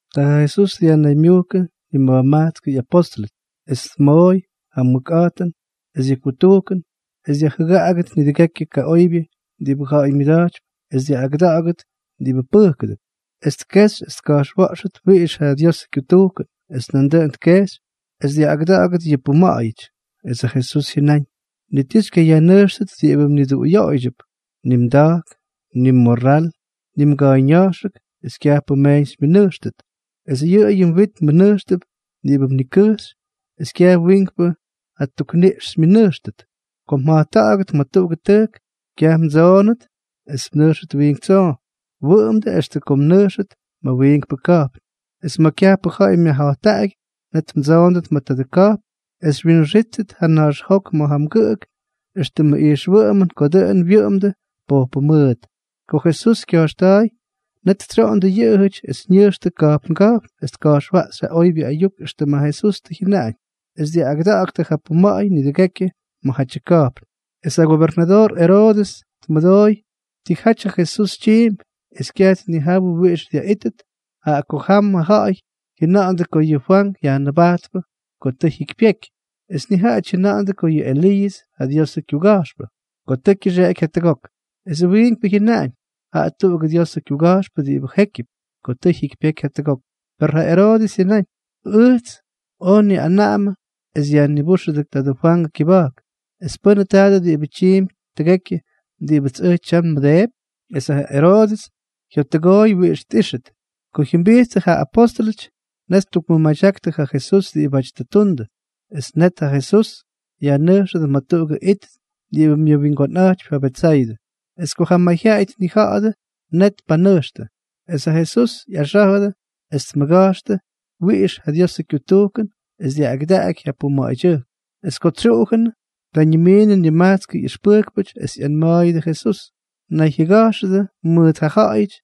Ta ja Jesús dyajnaymyujkʉ nima̱jmajtskʉ ꞌyapóstʉlʉty, es tmooy ja mʉkꞌa̱jtʉn es yʉ kutujkʉn es dyajjʉgaꞌagʉt nidʉgekyʉ kaꞌoybyʉ diꞌibʉ ja̱ꞌa̱y myʉda̱jtypy es dyaꞌꞌagʉda̱ꞌa̱gʉt diꞌibʉ pʉjkʉdʉp. Es tkejxy es tka̱jxwa̱ꞌxʉt wiꞌix ja Diosʉ kyutujkʉn. Es nandʉꞌʉn tkejxy es dyaꞌꞌagʉda̱ꞌa̱gʉt yʉ puma̱ꞌa̱yʉty. Es ja Jesús jyʉnáñ: —Ni ti xykyayajnʉjxtʉt diꞌibʉ mniduꞌuyoꞌoydyʉp. Ni mda̱jk, ni mmorral, ni mga̱a̱yña̱jxʉk es kyajpʉ mmeeñ xymyʉnʉjxtʉt. Es yʉꞌʉyʉ mwit mmʉnʉjxtʉp diꞌibʉ mnikʉjxy es kyaj wiinkpʉ ja tukniꞌx xymyʉnʉjxtʉt. Ko mja̱jtta̱ꞌa̱gʉt ma̱ tuꞌugʉ tʉjk, kyaj mdsoonʉt es mnʉjxʉt wiink tsoo, wʉꞌʉmdʉ extʉ ko mnʉjxʉt ma̱ wiinkpʉ ka̱jpn. Es ma̱ kyajpʉ ja̱ꞌa̱y myajja̱jttaꞌagyʉty, net mdsoondʉt ma̱ tadʉ ka̱jpn es xywyinxíttʉt ja naxjok ma̱ ja mgʉꞌʉk éxtʉmʉ ijxwʉꞌʉmʉn ko dʉꞌʉn wyʉꞌʉmdʉ pojpʉ mʉʉt. Ko Jesús kya̱jxta̱a̱y, net tsyoꞌondʉ yʉꞌʉjʉty es ñʉjxtʉ ka̱jpnga̱jpn es tka̱jxwaꞌxy ja oybyʉ ayuk éxtʉm ja Jesús tʉ jyʉnaꞌañ, es dyaꞌꞌagʉda̱ꞌa̱ktʉ ja puma̱ꞌa̱y nidʉgekyʉ ma̱jatyʉ ka̱jpn. Es ja gobernadoor Eroodʉs tmʉdooy tijaty ja Jesús tyiimpy, es kyaj tnijawʉ wiꞌix dyaꞌítʉt, jaꞌa ko jamʉ ja̱ꞌa̱y jyʉna̱ꞌa̱ndʉ ko yʉꞌʉ Fwank Yajnʉbajtpʉ ko tʉ jyikypyeky. Es nijaꞌajʉty jyʉna̱ꞌa̱ndʉ ko yʉꞌʉ Eliiʉs ja Diosʉ kyuga̱jxpʉ, ko tʉ kyʉxeꞌeky jatʉgok. Esʉ wiinkpʉ jyʉnaꞌañ: —Jaꞌa tuꞌugʉ Diosʉ kyuga̱jxpʉ diꞌibʉ jékyʉp, ko tʉ jyikypyeky jatʉgok. Per ja Eroodʉs jyʉnáñ: —Ʉjts oj nniꞌanaꞌamʉ es yajnibúxʉdʉ tadʉ Fwangʉ kyʉba̱jk, ¿es pʉ́nʉ tadʉ diꞌibʉ tyiimpy tʉgekyʉ diꞌibʉts ʉj tyam nmʉdeepy? Es ja Eroodʉs jyottʉgooy wiꞌix tꞌíxʉt. Ko jyʉmbijttʉ ja apóstʉlʉty, net ttukmʉmadyaktʉ ja Jesús diꞌibáty tʉ ttundʉ. Es net ja Jesús yajnʉjxʉdʉ ma̱ tuꞌugʉ it diꞌibʉ myʉwingonꞌa̱jtypy ja Betsaydʉ. Es ko ja mayjyaꞌay tnija̱ꞌa̱dʉ, net tpanʉjxtʉ. Es ja Jesús ꞌyaxá̱jʉdʉ es tmʉga̱jxtʉ wiꞌix ja Diosʉ kyutujkʉn es dyaꞌꞌagʉdaky ja puma̱ꞌa̱ydyʉjk. Es ko tsyuꞌujʉnʉ, ta ñimiinʉ nima̱jmajtskʉ ꞌyʉxpʉjkpʉty es ꞌyanma̱a̱yʉdʉ Jesús: —Nayjyʉga̱jxʉdʉ mʉʉt ja ja̱ꞌa̱yʉty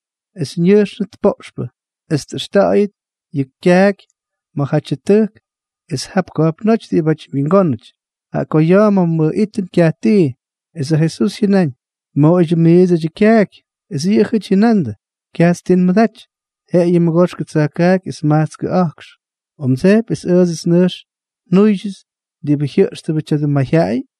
es ñʉjxnʉt poꞌxpʉ es tꞌʉxta̱ꞌa̱yʉt yʉ kyaaky ma̱jatyʉ tʉjk es jap ka̱jpnóty diꞌibáty wingónʉty, jaꞌa ko ya̱a̱ ma̱ nꞌijtʉm kyaj tii. Es ja Jesús jyʉnáñ: —Moꞌoydyʉ miidsʉty ja kyaaky. Es yʉꞌʉjʉty jyʉnandʉ: —Kyajts ti nmʉdaty, jeꞌeyʉ mʉgoxkʉ tsa̱jkaaky es majtskʉ a̱jkx. ¿O mdsejpy es ʉʉdsʉty nʉjx njúydyʉts diꞌibʉ jyʉꞌxtʉbʉ tya̱dʉ mayjyaꞌay?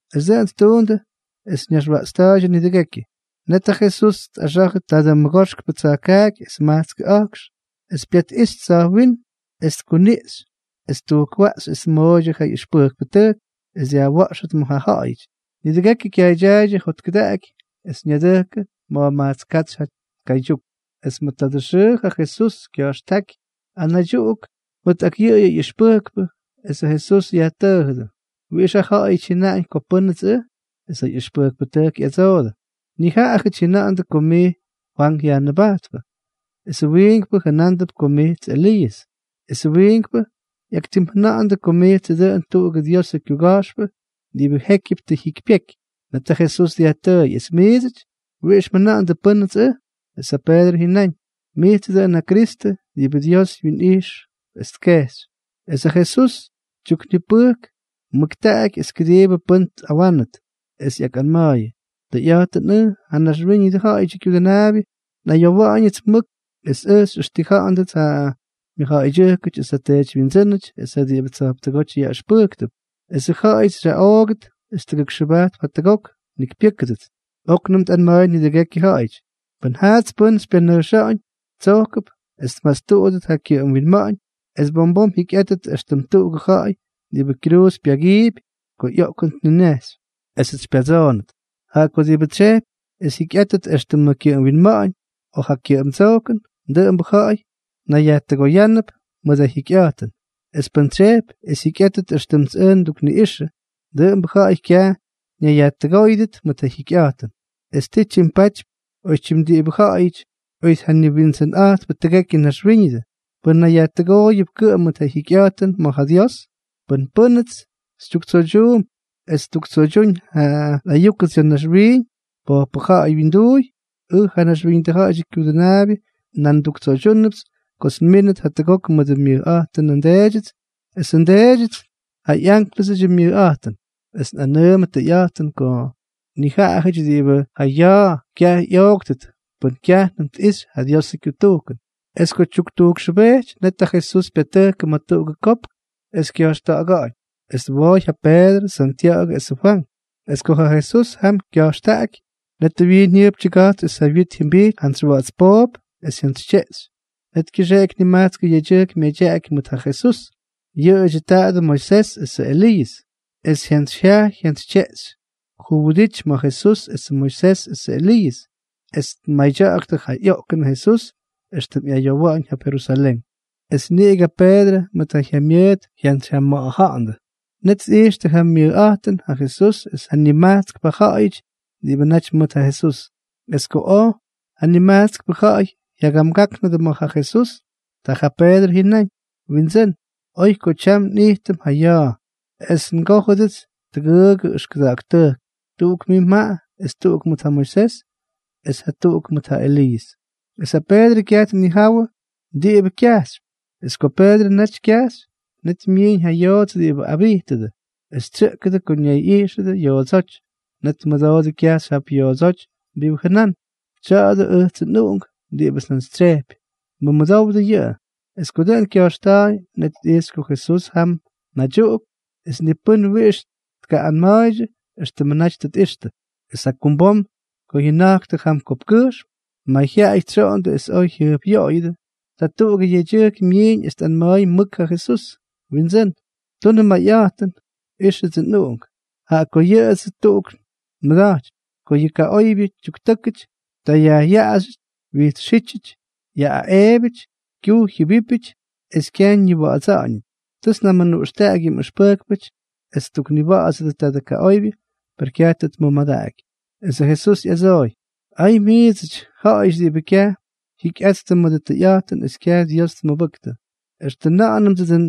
Es dʉꞌʉn ttuundʉ es ñaxwaꞌtsta̱a̱ydyʉ nidʉgekyʉ. Net ja Jesús tꞌaxa̱jʉ tadʉ mʉgoxkʉ tsa̱jkaaky es majtskʉ a̱jkx, es pyatꞌijxy tsa̱jwínm es tkuniꞌxy es ttujkwaꞌxy es tmooydyʉ ja ꞌyʉxpʉjkpʉtʉjk es dyajwa̱ꞌxʉt ma̱ ja ja̱ꞌa̱yʉty. Nidʉgekyʉ kyaaydyaaydyʉ jotkʉdaꞌaky, es ñadʉjkʉ ma̱jmajtsk katsy ja ka̱ydyuk. Es ma̱ tuꞌugʉ xʉʉ ja Jesús kya̱jxtáky anaydyuꞌuk mʉt ak yʉꞌʉdyʉ ꞌyʉxpʉjkpʉ. Esʉ Jesús yajtʉʉjʉdʉ: —¿Wiꞌix ja ja̱ꞌa̱yʉty jyʉnaꞌañ ko pʉ́nʉts ʉj? Es ja ꞌyʉxpʉjkpʉtʉjk ꞌyadsoodʉ: —Nijaꞌajʉty jyʉna̱ꞌa̱ndʉ ko mijts Fwank Yajnʉbajtpʉ, es wiinkpʉ jʉnándʉp ko mijts Eliiʉs, es wiinkpʉ ꞌyaktimjʉna̱ꞌa̱ndʉ ko mijtsʉ dʉꞌʉn tuꞌugʉ Diosʉ kyuga̱jxpʉ jékyʉbʉ diꞌibʉ tʉ jyikypyeky. Net ja Jesús dyajtʉʉy: —Es miidsʉty, ¿wiꞌix mjʉna̱ꞌa̱ndʉ pʉ́nʉts ʉj? Es ja Peedrʉ jyʉnáñ: —Mijtsʉ dʉꞌʉn ja Kristʉ diꞌibʉ Dios wyinꞌijx es tkejxy. Es ja Jesús tyuknipʉjk mʉktaꞌaky es kʉdiibʉ pʉ́n tꞌawánʉt. Es ꞌyakꞌanma̱a̱yʉ: —Tʉyꞌa̱jtʉn ʉj, ja Naxwíñʉdʉ Ja̱ꞌa̱yʉdyʉ Kyudʉnaabyʉ, nꞌayowa̱ꞌa̱ñʉts mʉk es ʉj xyꞌʉxtija̱ꞌa̱ndʉts ja mʉjja̱ꞌa̱ydyʉjkʉty esʉ teedywyindsʉ́nʉty es ja diꞌibʉ tsa̱jptʉgóty yaꞌʉxpʉjktʉp, esʉ ja̱ꞌa̱yʉts xyaꞌoogʉt es tʉgʉkxʉbajtp jatʉgok njikypyʉ́kʉdʉts. Oknʉm tꞌanma̱a̱y nidʉgekyʉ ja̱ꞌa̱yʉty: —Pʉn jaats pʉ́n xypyanʉjxa̱ꞌa̱ñ, tsojkʉp es tmastuꞌudʉt ja kyʉꞌʉm winma̱ꞌa̱ñ es bom bom jyikyꞌátʉt éxtʉm tuꞌugʉ ja̱ꞌa̱y diꞌibʉ kyruuz pyagiipy ko ꞌyoꞌkʉn tninejxy, esʉts xypyatsoonʉt. Jaꞌa ko diꞌibʉ tsyejpy es jyikyꞌátʉt éxtʉmʉ kyʉꞌʉm winma̱ꞌa̱ñ o ja kyʉꞌʉmdsojkʉn, dʉꞌʉmbʉ ja̱ꞌa̱y nayyajtʉgóyʉdʉp mʉt ja jyikyꞌa̱jtʉn. Es pʉ́n tsyejpy es jyikyꞌátʉt éxtʉmts ʉj ndukniꞌꞌixʉ, dʉꞌʉmbʉ ja̱ꞌa̱y kyaj ñayyajtʉgóyʉdʉt mʉt ja jyikyꞌa̱jtʉn. ¿Es ti tyimpatypy oytyim diꞌibʉ ja̱ꞌa̱yʉty oy tjaniwindsʉnꞌa̱jtpʉ tʉgekyʉ naxwíñʉdʉ, pʉn nayyajtʉgooyʉp kʉꞌʉm mʉt ja jyikyꞌa̱jtʉn ma̱ ja Dios? Pʉn pʉ́nʉts xytyuktsoydyuump es ttuktsoydyúñ ja nꞌayúkʉts ya̱ naxwiiñ pojpʉ ja̱ꞌa̱y wyinduuy, ʉj, ja Naxwíñʉdʉ Ja̱ꞌa̱yʉdyʉ Kyudʉnaabyʉ, nan nduktsoydyúnʉpts kots nmínʉt jatʉgok mʉdʉ myʉjꞌa̱jtʉnʉ nDeedyʉts esʉ nDeedyʉts ja ꞌyánklʉsʉdyʉ myʉjꞌa̱jtʉn. Es nꞌanʉʉmʉ tʉyꞌa̱jtʉn ko nijaꞌajʉty diꞌibʉ ja ya̱a̱ kyaj ꞌyooktʉt pʉn kyajnʉm tꞌixy ja Diosʉ kyutujkʉn. Es ko tyuktujkxʉbejty, net ja Jesús pyatʉjkʉ ma̱ tuꞌugʉ kopk es kya̱jxta̱ꞌa̱ga̱ꞌa̱ñ. Es twooy ja Peedrʉ, Santya̱ꞌa̱gʉ esʉ Fwank. Es ko ja Jesús jam kya̱jxtaꞌaky, net ja wyiin jyʉjp tyʉga̱jtsy es ja wyit jyʉmbijty jantsy wa̱ꞌa̱ts poop es jyantsytyeꞌxy. Net kyʉxeꞌky nimajtskʉ yedyʉjk myadyaꞌaky mʉt ja Jesús. Yʉꞌʉdyʉ tadʉ Moisés esʉ Eliiʉs. Es jyantsyjyajy jyantsytyeꞌxy juwʉdity ma̱ Jesús esʉ Moisés esʉ Eliiʉs, es tmadya̱ꞌa̱ktʉ ja ꞌyoꞌkʉnʉ Jesús éxtʉm ꞌyayowa̱ꞌa̱ñ jap Jerusalén. Es niꞌigʉ ja Peedrʉ mʉt ja jyamyʉʉt jyantsyjyama̱ꞌa̱ja̱ꞌa̱ndʉ. Net tꞌijxtʉ ja myʉjꞌa̱jtʉn ja Jesús es ja nimajtskpʉ ja̱ꞌa̱yʉty diꞌibʉ naty mʉt ja Jesús. Es ko ja nimajtskpʉ ja̱ꞌa̱y jyagamgáknʉdʉ ma̱ ja Jesús, ta ja Peedrʉ jyʉnáñ: —Windsʉ́n, oy ko tyam nꞌijtʉm ja ya̱a̱. Es ngójʉdʉts tʉgʉʉgʉ ʉxkʉda̱ꞌa̱k tʉjk: tuꞌuk mʉt mij es tuꞌuk mʉt ja Moisés es jatuꞌuk mʉt ja Eliiʉs. Es ja Peedrʉ kyaj tnijawʉ diꞌibʉ kyajxypy. Es ko Peedrʉ naty kyajxy, net myiiñ ja yoots diꞌibʉ abijtʉdʉ, es tsyʉꞌkʉdʉ ko ñayꞌijxʉdʉ yoodsóty. Net tmʉdoodʉ kyajxy jap yoodsóty diꞌibʉ jʉnán: —Tya̱a̱dʉ ʉjtsʉ nꞌUꞌunk diꞌibʉts njantsytsyejpy. Mʉmʉdowdʉ yʉꞌʉ. Es ko dʉꞌʉn kya̱jxta̱a̱y, net tꞌijxy ko Jesús jam naydyuꞌuk. Es ni pʉ́n wiꞌix tkaꞌꞌanma̱a̱ydyʉ éxtʉmʉ naty tʉ tꞌixtʉ. Es jakumbom ko jyʉna̱jktʉ jam kopkkʉjxm, mayjyaꞌay tsyoꞌondʉ es oj jyʉjpꞌyoꞌoyʉdʉ. Ta tuꞌugʉ yedyʉjk myiiñ es tꞌanma̱a̱y mʉk ja Jesús: —Windsʉ́n, tunʉ mayꞌa̱jtʉn. Ixʉdsʉ nꞌuꞌunk, jaꞌa ko yʉꞌʉyʉts tuꞌuk nmʉda̱jtypy. Ko yʉ kaꞌoybyʉ tyuktʉ́kʉty, ta yajꞌyaꞌaxyʉty, wyijtsxítyʉty, yaꞌꞌaꞌeebyʉty, kyujy jyʉbípyʉty es kyaj ñiwa̱ꞌa̱dsa̱ꞌa̱ñʉty. Tʉts njamʉnuꞌxtaꞌaky yʉ mꞌʉxpʉjkpʉty es ttukniwa̱ꞌa̱dsʉdʉ tadʉ kaꞌoybyʉ, per kyaj tʉ tmʉmadaꞌaky. Esʉ Jesús ꞌyadsooy: —¡Ay miidsʉty, ja̱ꞌa̱yʉty diꞌibʉ kyaj jyikyꞌattʉ mʉdʉ tʉyꞌa̱jtʉn es kyaj Dios tmʉbʉktʉ! ¿Extʉ nʉꞌʉnʉdsʉ dʉꞌʉn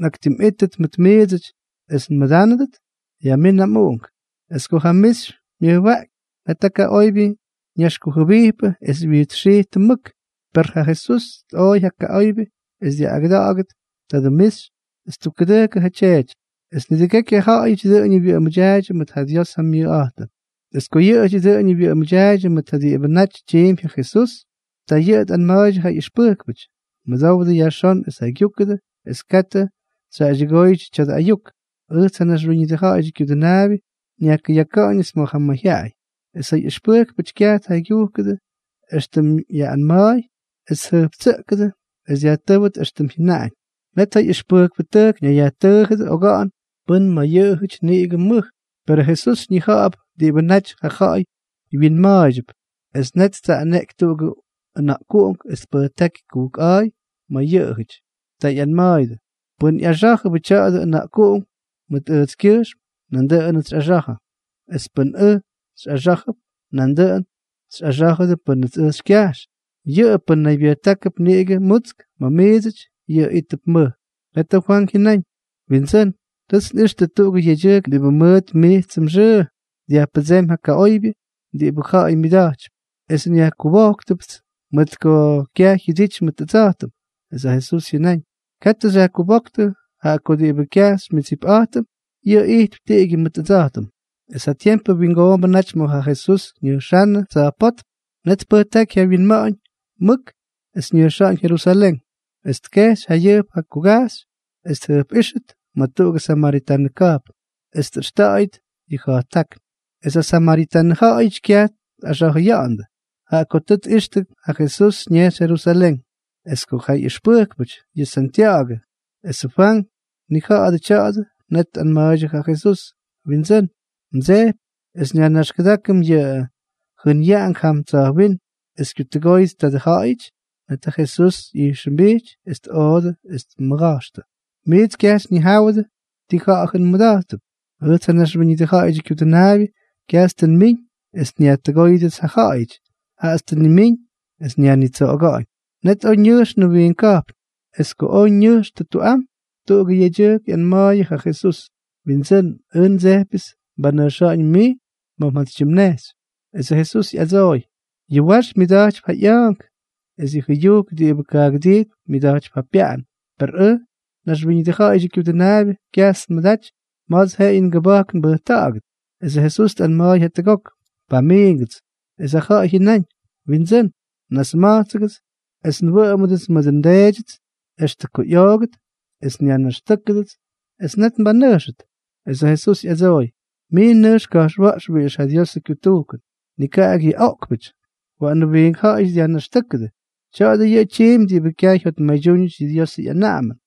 nꞌaktimꞌítʉt mʉt miidsʉty es nmʉdánʉdʉt? Yajmín ja mꞌuꞌunk. Es ko ja mixy myʉjwaꞌky, net ja kaꞌoybyʉ ñaxkujʉbijpʉ es wyijtsxijtʉ mʉk. Per ja Jesús tꞌooy ja kaꞌoybyʉ es dyaꞌꞌagʉdaky tadʉ mixy es ttukkʉdʉjkʉ ja tyeety. Es nidʉgekyʉ ja̱ꞌa̱yʉty dʉꞌʉñʉ wyʉꞌʉmʉdyaaydyʉ mʉt ja Dios ja myʉjꞌa̱jtʉn. Es ko yʉꞌʉjʉty dʉꞌʉñʉ wyʉꞌʉmʉdyaaydyʉ mʉt diꞌibʉ naty tyiimpy ja Jesús, ta yʉꞌʉ tꞌanma̱a̱ydyʉ ja ꞌyʉxpʉjkpʉty: —Mʉdowdʉ yajxón es jaygyúkʉdʉ es katʉ xyjaꞌaydyʉgóydyʉ tya̱dʉ ayuk. Ʉjts, ja Naxwíñʉdʉ Ja̱ꞌa̱yʉdyʉ Kyudʉnaabyʉ, nyajkʉyaka̱ꞌa̱ñʉts ma̱ ja mayjyaꞌay. Es ja ꞌyʉxpʉjkpʉtʉjk kyaj tjaygyujkʉdʉ éxtʉm yaꞌꞌanma̱a̱y es tjʉjptsʉꞌkʉdʉ es dyajtʉ́wʉt éxtʉm tʉ jyʉnaꞌañ. Net ja ꞌyʉxpʉjkpʉtʉjk ñayyajtʉʉjʉdʉ oga̱ꞌa̱n pʉ́n ma̱ yʉꞌʉjʉty niꞌigʉ mʉj. Perʉ Jesús ñija̱ꞌa̱p diꞌibʉ naty ja ja̱ꞌa̱y wyinma̱a̱ydyʉp, es net ttsaꞌaneꞌky tuꞌugʉ ʉna̱ꞌkuꞌunk es tpʉjtáky kujkꞌa̱a̱y ma̱ yʉꞌʉjʉty. Ta ꞌyanma̱a̱yʉdʉ: —Pʉ́n ꞌyaxá̱jʉbʉ tya̱dʉ ʉna̱ꞌkuꞌunk mʉt ʉjtskyʉjxm, nandʉꞌʉnʉts xyꞌaxa̱jʉ. Es pʉ́nʉts ʉj xyꞌaxá̱jʉp, nandʉꞌʉn xyꞌaxá̱jʉdʉ pʉ́nʉts ʉj xykyajx. Yʉꞌʉ pʉ́n naybyʉjtákʉp niꞌigʉ mutsk ma̱ miidsʉty, yʉꞌʉ ítʉp mʉj. Net ja Fwank jyʉnáñ: —Windsʉ́n, tʉts nꞌixtʉ tuꞌugʉ yedyʉjk diꞌibʉ mʉt mijtsʉ mxʉʉ dyajpʉdsémy yʉ kaꞌoybyʉ diꞌibʉ ja̱ꞌa̱y myʉda̱jtypy. Es nyajkubojktʉpts mʉt ko kyaj jyʉdity mʉt ʉdsa̱jtʉm. Es ja Jesús jyʉnáñ: —Katʉ xyajkubóktʉ, jaꞌa ko diꞌibʉ kyaj xymyʉdsipꞌa̱jtʉm, yʉꞌʉ ijtp tiꞌigyʉ mʉt ʉdsa̱jtʉm. Es ja tiempʉ wingoombʉ naty ma̱ ja Jesús ñʉjxánnʉ tsa̱jpótm. Net tpʉjtáky ja wyinma̱ꞌa̱ñ mʉk es ñʉjxa̱ꞌa̱ñ Jerusalén. Es tkejxy jayʉjp ja kugajxy es tjʉjpꞌíxʉt ma̱ tuꞌugʉ samaritanʉ ka̱jpn, es tꞌʉxta̱ꞌa̱yʉt yʉ ja̱jttákn. Es ja samaritanʉ ja̱ꞌa̱yʉty kyaj tꞌaxa̱jʉyandʉ, jaꞌa ko tꞌixtʉ ko ja Jesús ñejxy Jerusalén. Es ko ja ꞌyʉxpʉjkpʉty, yʉ Santya̱ꞌa̱gʉ es ja Fwank, tnija̱ꞌa̱dʉ tya̱a̱dʉ, net tꞌanma̱a̱ydyʉ ja Jesús: —Windsʉ́n, ¿mdsejpy es nyajnaxkʉdákʉm yʉ jʉnyaꞌank jam tsa̱jwínm es kyutʉgóyʉt tadʉ ja̱ꞌa̱yʉty? Net ja Jesús ꞌyijxʉmbijty es tꞌoodʉ es tmʉga̱jxtʉ: —Miits kyaj xyñijáwʉdʉ ti ja̱ꞌa̱jʉn mmʉda̱jttʉp. Ʉjts, ja Naxwíñʉdʉ Ja̱ꞌa̱yʉdyʉ Kyudʉnaabyʉ, kyajts tʉ nmiñ es nyajtʉgóyʉdʉts ja ja̱ꞌa̱yʉty, jaꞌats tʉ nnimíñ esʉts nyajnitsoꞌoga̱ꞌa̱ñ. Net oj ñʉjxtʉ wiink ka̱jpn. Es ko oj ñʉjxtʉ tuꞌam, ta tuꞌugʉ yedyʉjk ꞌyanma̱a̱yʉ ja Jesús: —Windsʉ́n, ʉj ndsejpyʉts mbanʉjxa̱ꞌa̱ñ mij ma̱ mjantsytyimnejxy. Esʉ Jesús ꞌyadsooy: —Yʉ wax myʉda̱jtypy ja ꞌya̱a̱nk, es yʉ jʉyujk diꞌibʉ kaagʉdijtp myʉda̱jtypy ja pyaꞌan, per ʉj, ja Naxwíñʉdʉ Ja̱ꞌa̱yʉdyʉ Kyudʉnaabyʉ, kyajts nmʉdaty ma̱ts jeꞌeyʉ ngʉba̱jk nbʉjta̱ꞌa̱gʉt. Esʉ Jesús tꞌanma̱a̱y jatuꞌuk: —Pamiingʉts. Es ja ja̱ꞌa̱y jyʉnáñ: —Windsʉ́n, nasma̱jtsʉgʉts es nwʉꞌʉmdʉts mʉdʉ ndeedyʉts extʉ ko ꞌyoogʉt es nyajnaxtʉ́kʉdʉts, es net nbanʉjxʉt. Es ja Jesús tꞌadsooy: —Mij nʉjx ka̱jxwa̱ꞌx wiꞌix ja Diosʉ kyutujkʉn. Nikaꞌak yʉ oꞌkpʉty. Waꞌanʉ wiink ja̱ꞌa̱yʉty dyajnaxtʉ́kʉdʉ. Tya̱a̱dʉ yʉꞌʉ tyiimpy diꞌibʉ kyaj jyotmaydyúñʉty yʉ Diosʉ ꞌyanaꞌamʉn.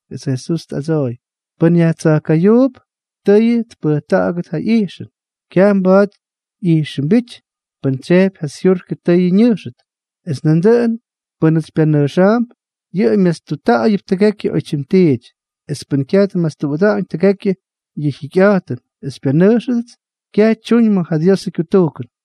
Esʉ Jesús tꞌadsooy: —Pʉ́n yajtsa̱jka̱yuup, tʉyʉ tpʉjta̱ꞌa̱gʉt ja ꞌyijxʉn. Kyaj mba̱a̱t ꞌyijxʉmbíty pʉn tsyejpy ja syurkʉ tʉyʉ ñʉjxʉt. Es nandʉꞌʉn pʉ́nʉts xypyanʉjxa̱a̱mp, yʉꞌʉ myastutta̱ꞌa̱yʉp tʉgekyʉ oytyim tiity. Es pʉ́n kyaj tmastuꞌuda̱ꞌa̱ñ tʉgekyʉ yʉ jyikyꞌa̱jtʉn es xypyanʉjxʉdʉts, kyaj tyuñ ma̱ ja Diosʉ kyutujkʉn.